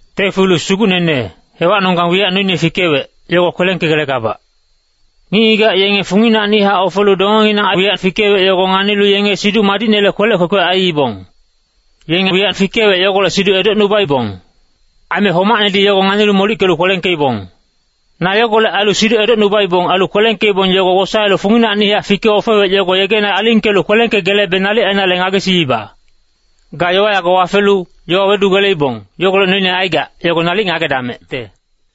Tiofilus sugucnene, hewacnonggang wiyac noine fikewec, yogo kwelengkegelegabac. Ngic-ngigac yenge funginacnihac ofelu dongenginang wiyac fikewec, yogo nganilu yenge Siduc Madicnele kwelec kwekwe aiibong. Yenge wiyac fikewec, yogolec siduc edocnubaibong. Aime homacnedi yogo nganilu molickelu kwelengkeibong. Na yogolec ailu siduc edocnubaibong, ailu kwelengkeibong, yogo wosaelu funginacnihac fike-ofewec yogo yegena alingkelu kwelengkegelebe nalic ainale ngagesiiba. Ga yowa yago wafelu, yowa wedugeleibong, yogolec noine aigac, yogo nalic ngagedamecte.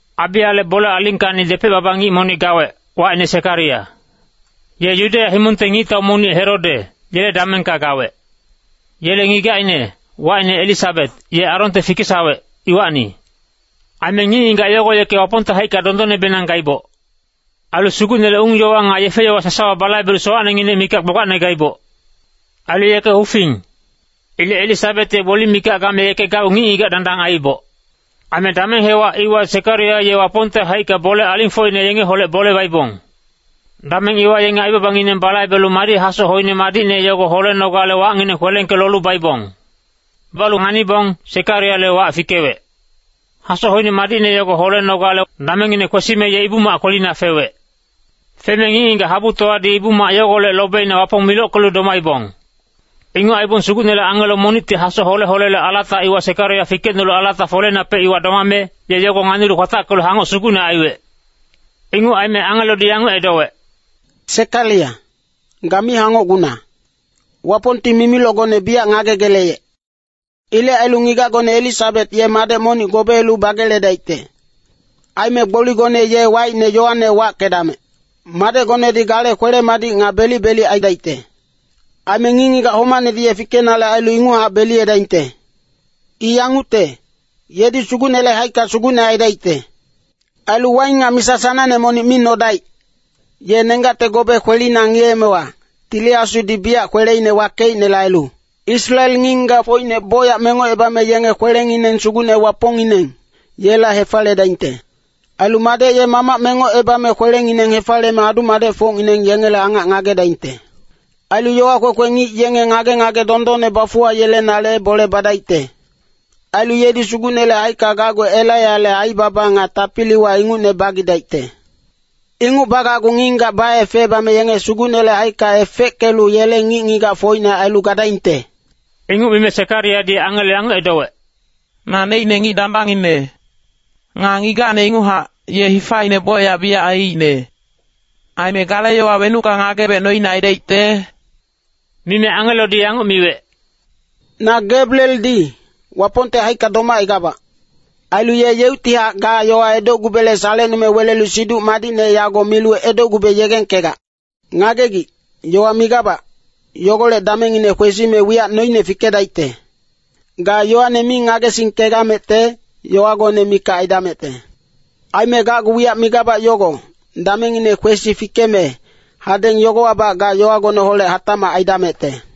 Abiyale bole alingkacni depec-baba ngic monic gawec, wacine Sekariya. Ye Yudeya himongte ngictau monic Herode, yele damengka gawec. Yele ngigacine, wacine Elisabet, ye Aronte fikesawec, iwacni. Aime ngic-ngigac yogo yeke Wapongte haicka dondonnebenang gaiboc. Ailu Sugucnele ung-yowa nga yefe-yowa sasawa balaibelu sowacnenginec mikac gbagbacne gaiboc. Ailu yeke hufing. Ilec Elisabet ye gboli mikac game yeke gacgu ngic-ngigac dandang aiiboc. Aime dameng hewac iwa Sekariya ye Wapongte haicka bole alingfocine yengeholec bole baibong. Dameng iwa yenge aibabangineng balaibelu madi hasoc hoine madicne yogo holenogale wacngineng kwelengke-lolu baibong. Balu nganibong, Sekariyale wac fikewec. Hasoc hoine madicne yogo holenogale damengngine kwesime, ye Ibu-mac kwelina fewec. Feme ngic-ngigac habutowadi Ibu-mac yogolec lobeina Wapong milockelu domaibong. Inguc aibong Sugucnele angelo monicti hasoc hole-holele alata iwa, Sekariya fikecnolu alata foleinapec iwa domame, ye yogo nganilu kwatackelu hangoc sugucne aiwec. Inguc aime angelodi yanguc edowec, “Sekariya, ga mi hangocguna! Wapongti mimilocgone biyac ngagegeleyec. Ilec ailu ngigacgone Elisabet ye madec monic gobeelu bageledaicte. Aime gboligone ye wacine Yoane wackedamec! Madecgonedi gale kwele-madic nga belic-belic aidaicte. Aime ngic-ngigac homacnedi ye fikenale ailu inguchac beliyedaingte. I yangucte, yedi Sugucnele haicka sugucne aidaicte. Ailu waing nga misa sanangne monic mi nodaic. Ye nenggacte gobe kwelina ngiyeemewa, Tili Asudi biyac kweleine wakeicnele ailu, Israel ngic-ngigacfocine bocyac mengocebame yenge kwelengineng Sugucne Wapongngineng, yela hefaliyedaingte. Ailu madec ye mamac mengocebame kwelengineng hefaliyeme adu-madecfocngineng yengele angac ngagedaingte. Ailu yowa kwekwe ngic yenge ngage-ngage dondonne bafuwayelenale bole badaicte. Ailu yedi Sugucnele haicka gacgu Elaiyale aibaba nga tapiliwa ingucne bagidaicte. Inguc bagacgu ngic-ngigac baefecebame yenge Sugucnele haicka efeckelu yele ngic-ngigacfocine ailu gadaingte.” Inguc mime Sekariyadi angelo yanguc edowec, “Naneicne ngic dandangngine. Nga ngigacne inguchac, ye hifaine bocyac biyac aiicne. Aime gale yowa wenucka ngagebec noine aidaicte?” Mime angelodi yanguc miwec, “Na Gabrieldi, Wapongte haicka domacaigabac. Ailu ye yeuctihac ga yowa edocgubele salecnume welelu Siduc Madicne yago milu edocgube yegengkegac. Ngagegic, yowa migabac, yogolec damengngine kwesime wiyac noine fikedaicte. Ga yowane mi ngagesingkegamecte, yowagone mikac aidamecte. Aime gacgu wiyac migabac yogo, damengngine kwesi fikeme, hadeng yogowabac ga yowagoneholec hatacmac aidamecte.”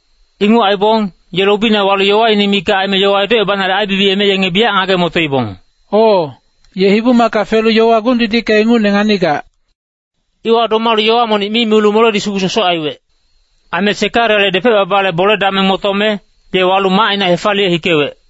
Inguc aibong, ye lobina walu yowaine mikac aime, yowa edocebanale aibibiyeme yenge biyac ngage-motoibong, “O, ye Ibu-macka felu yowa gung-didicka ingucne nganigac.” Iwa domalu yowa monic mi milu moledi sugu sosoc aiwec. Aime Sekariyale depec-babale bole-dameng motome, ye walu macina hefaliye hikewec.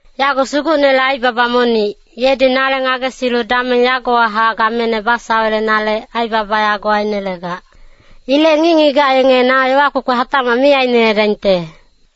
“Yago Sugucnele aibaba monic, yedi nale ngagesilu dameng yagowahac gamene basawelenale, aibaba yago ainelegac. Ilec ngic-ngigac yenge na yowa kwekwe hatacmac mi aineledaingte.”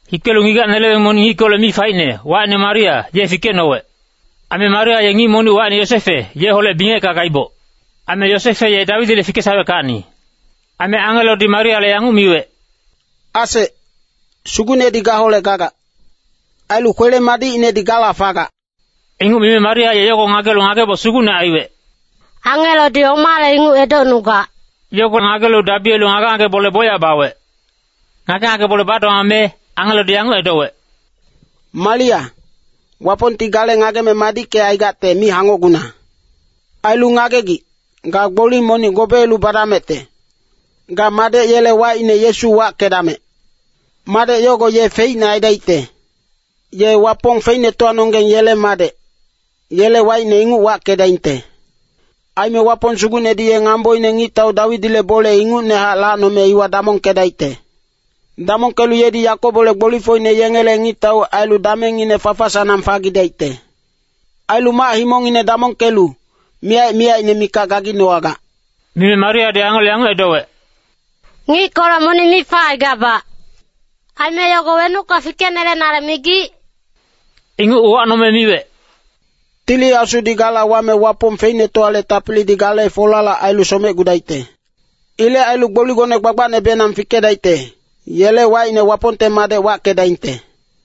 Hikelu ngigac-neleweng monic ngickolec mi faicne, wacine Maria, ye fikecnowec. Aime Maria ye ngic monic, wacine Yosefe, yeholec bingecka gaiboc. Aime Yosefe ye Dawidile fikesaweckacni. Aime angelodi Mariale yanguc miwec, “Asec, Sugucnedi gaholec gagac. Ailu kwele-madicinedi gala fagac!” Inguc mime Maria ye yogo ngagelu ngageboc sugucne aiwec, “Angelodi omale inguc edocnugac,” yogo ngagelu dabiyelu ngage-ngage bole bocyac bawec. Ngage-ngage bole badomame, angelodi yanguc edowec, “Maria, Wapongti gale ngageme madickecaigacte mi hangocguna. Ailu ngagegic, ga gboli monic gobeelu badamecte. Ga madec yele wacine Yesu wackedamec! Madec yogo ye feicne aidaicte. Ye Wapong Feicnetowanonggeng yele madec, yele wacine inguc wackedaingte. Aime Wapong Sugucnedi ye ngamboine Ngictau Dawidile bole ingucnehac lacnome iwa damongkedaicte. Damongkelu yedi Yakobole gbolifocine yengele ngictau ailu damengngine fafa-sanang fagidaicte. Ailu mac-himongine damongkelu, miyac-miyacine mikac gaginowagac.” Mime Mariadi angelo yanguc edowec, “Ngickolec monic mi facaigabac. Aime yogo wenucka fikenelenale migic?” Inguc uwacnome miwec, “Tili Asudi gala wame Wapong Feicnetowale tapilidi gale folalac ailu somecgudaicte. Ilec ailu gboligone gbagbacnebenang fikedaicte, yele wacine Wapongte Madec wackedaingte.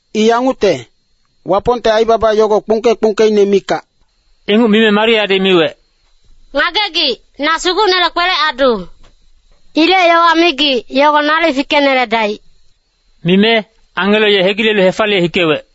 I yangucte, Wapongte aibaba yogo kpungke-kpungkeine mikac.” Inguc mime Mariadi miwec, “Ngagegic, na Sugucnele kwelec-adu. Ilec yowa migic, yogo nalic fikeneledaic.” Mime, angelo ye hegilelu hefaliye hikewec.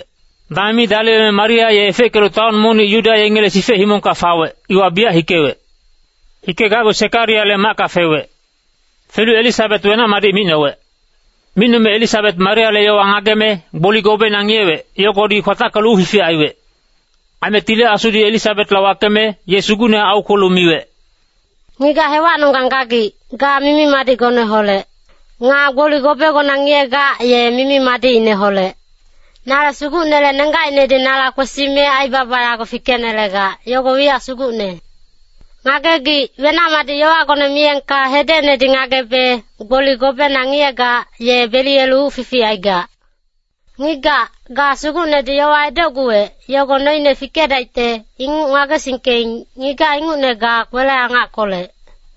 Dameng mi daliweme Maria ye efeckelu taon monic Yuda yengele sifec himongka fawec, iwa biyac hikewec. Hikegacgu Sekariyale macka fewec. Felu Elisabet wenac-madic micnowec. Micnome Elisabet Mariale yowa ngageme, gboli gobeina ngiyewec, yogodi kwatackelu uc fific aiwec. Aime Tili Asudi Elisabetla wakeme, ye sugucnehac aukwelu miwec, “Ngigac hewacnonggang gagic, ga mimi-madicgoneholec. Nga gboli gobegona ngiyegac, ye mimi-madicineholec. Nale Sugucnele nenggacinedi nala kwesime aibaba yago fikenelegac, yogo wiyac sugucne. Ngagegic, wenac-madic yowagone miyengka hedecnedi ngagebe, gboli gobena ngiyegac, ye beliyelu uc fific aigac. Ngigac, ga, Sugucnedi yowa edocguwec, yogo noine fikedaicte, inguc ngagesingkeing, ngigac ingucne ga kwele-angackolec.”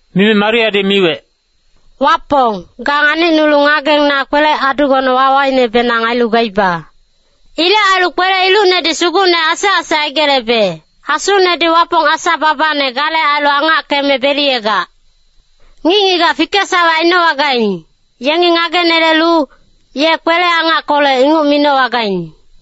Mime Mariadi miwec, “Wapong, ga nganicnulu ngageng na kwelec-adugone wawainebenang ailu gaiba. Ilec ailu kwele-ilucnedi Sugucne asec-asec aigelebe, Asunedi Wapong, asa-babane gale ailu angackeme beliyegac. Ngic-ngigac fikesawec ainowagaing, yengi ngagenelelu, ‘ye kwele-angackolec’ inguc minowagaing.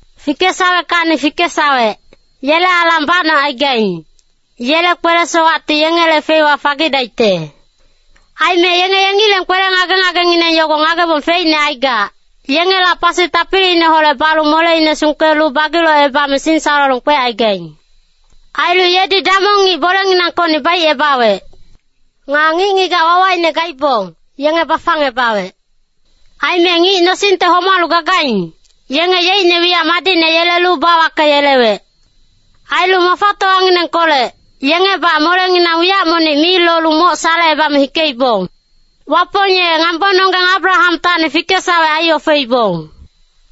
Fikesaweckacni fikesawec, yele alang bacnocaigaing, yele kwele-sowacti yengele feiwa fagidaicte. Aime yenge yengileng kwele ngage-ngagengineng yogo ngagebong feicne aigac, yengela pasi tapiliineholec balu moleine sungkelu bagi-locebame singsalolong kwecaigaing. Ailu yedi damong ngic bolenginangkocni baicebawec. Nga ngic-ngigac wawaine gaibong, yenge bafangebawec. Aime ngic nosingte homalu gagaing, yenge yeicne wiyac madicne yelelu bawakeyelewec. Ailu mafatowanginengkolec, yengebac molenginang wiyac monic mi lolu moc salecebame hikeibong. Wapong ye ngambononggeng Abrahamtacni fikesawec aiofeibong.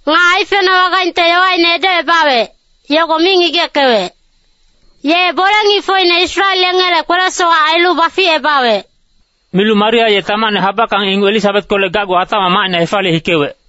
Nga aifenowagaingte yowaine edocebawec, yogo mi ngigeckewec. Ye bole-ngicfocine Israel yengele kwele-sowac ailu baficebawec.” Milu Maria ye tamacne habackang inguc Elisabetkolec gacgu hatacmac macina hefaliye hikewec.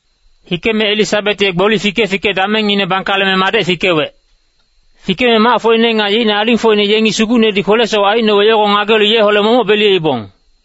Hikeme Elisabet ye gboli fike-fike damengngine bangkaleme madec fikewec. Fikeme macfocine nga yeicne alingfocine yengi Sugucnedi kwele-sowac aicnowec, yogo ngagelu yeholec momoc beliyeibong.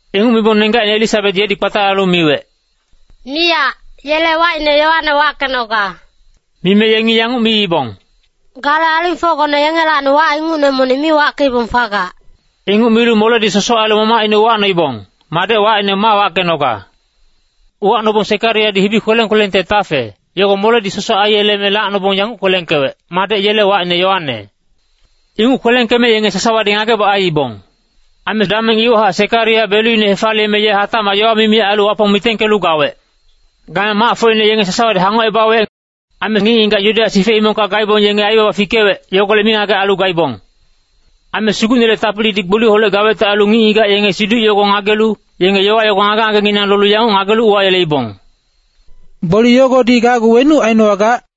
Inguc mibong nenggacine Elisabet yedi kpatalalu miwec, “Miyac, yele wacine Yoane wackenoga.” Mime yengi yanguc miibong, “Gale alingfocgone yengelacni wac ingucne monic mi wackeibong fagac.” Inguc milu moledi sosoc ailu mamacine uwacnoibong, madec wacine ma wackenoga. Uwacnobong Sekariyadi hibi kweleng-kwelengte tafe, yogo moledi sosoc aiyeleme lacnobong yanguc kwelengkewec, “Madec yele wacine Yoane.” Inguc kwelengkeme yenge sasawadi ngageboc aiibong. Aime dameng iwahac Sekariya beluine hefaliyeme ye hatacmac yowa mimi ailu Wapong mitengkelu gawec. Game macfocine yenge sasawadi hangocebawec. Aime ngic-ngigac Yudeya sifec himongka gaibong, yenge aibaba fikewec, yogolec mingagec ailu gaibong. Aime Sugucnele tapilidi gboliholec gawecte ailu ngic-ngigac yenge siduc yogo ngagelu, yenge yowa yogo ngage-ngagenginang lolu yanguc ngagelu uwayeleibong, “Gboli yogodi gacgu wenuc ainowagac?”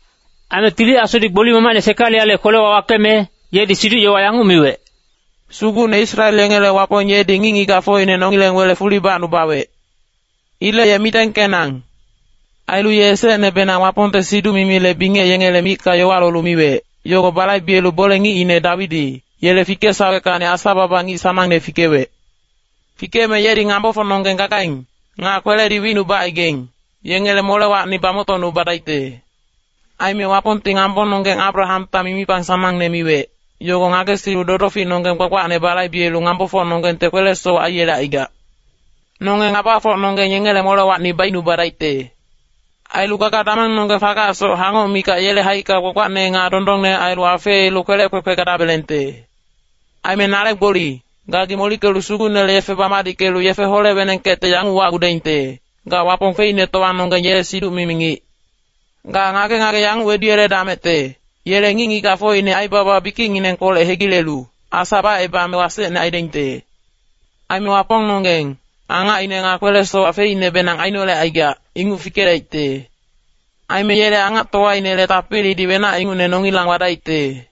Aime Tili Asudi gboli mamacine Sekariyale kwelewa wakeme, yedi siduc-yowa yanguc miwec, “Sugucne Israel yengele Wapong yedi ngic-ngigacfocine nongileng wele fuli bacnubawec. Ilec ye mitengkenang. Ailu ye esecnebenang Wapongte siduc-mimile bingec yengele micka yowa lolu miwec, yogo balaibelu bole-ngicine Dawidi, yele fikesaweckacni Asa-baba ngic sanangne fikewec. Fikeme yedi ngabafocnonggeng gagaing, nga kweledi wicnubacaigaing, yengele molewacni bamoctocnubadaicte. Aime Wapongti ngambononggeng Abrahamta mimipang sanangne miwec, yogo ngagesilu dodoficnonggeng gbagbacne balaibelu ngambofocnonggengte kwele-sowac aiyelecaigac. Nonge ngabafocnonggeng yengele molewacni baicnubadaicte. Ailu gaga-damengnonggeng fagacsoc hangoc mikac yele haicka gbagbacne nga dondonne ailu afeelu kwelec kwekwe gadabelengte. Aime nale gboli, gagi molickelu Sugucnele yefe bamadickelu yefe hole-wenengkecte yanguc wacgudaingte, ga Wapong Feicnetowanonggeng yele siduc-mimi ngic. Ga ngage-ngage yanguc weduyeledamecte, yele ngic-ngigacfocine aibaba bikicnginengkolec hegilelu, Asa bacebame wasecne aidaingte. Aime Wapongnonggeng, angacine nga kwele-sowac feicnebenang ainolecaigac, inguc fikedaicte. Aime yele angactowainele tapilidi wenac ingucne nongilang wadaicte.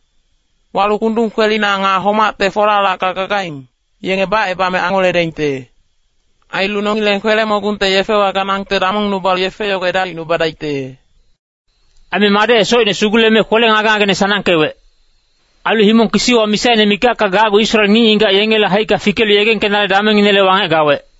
Walu kundung kwelina nga homacte folalacka gagaing, yenge bacebame angoledaingte. Ailu nongileng kwele-mogungte yefewa ganangte damongnubalu yefe yogo edalicnubadaicte.” Aime madec ye socine suguleme, kwele ngage-ngageine sanangkewec. Ailu himong kisiwa misaine mikacka gacgu Israel ngic-ngigac yengele haicka fikelu yegengkenale damengnginele wangec gawec.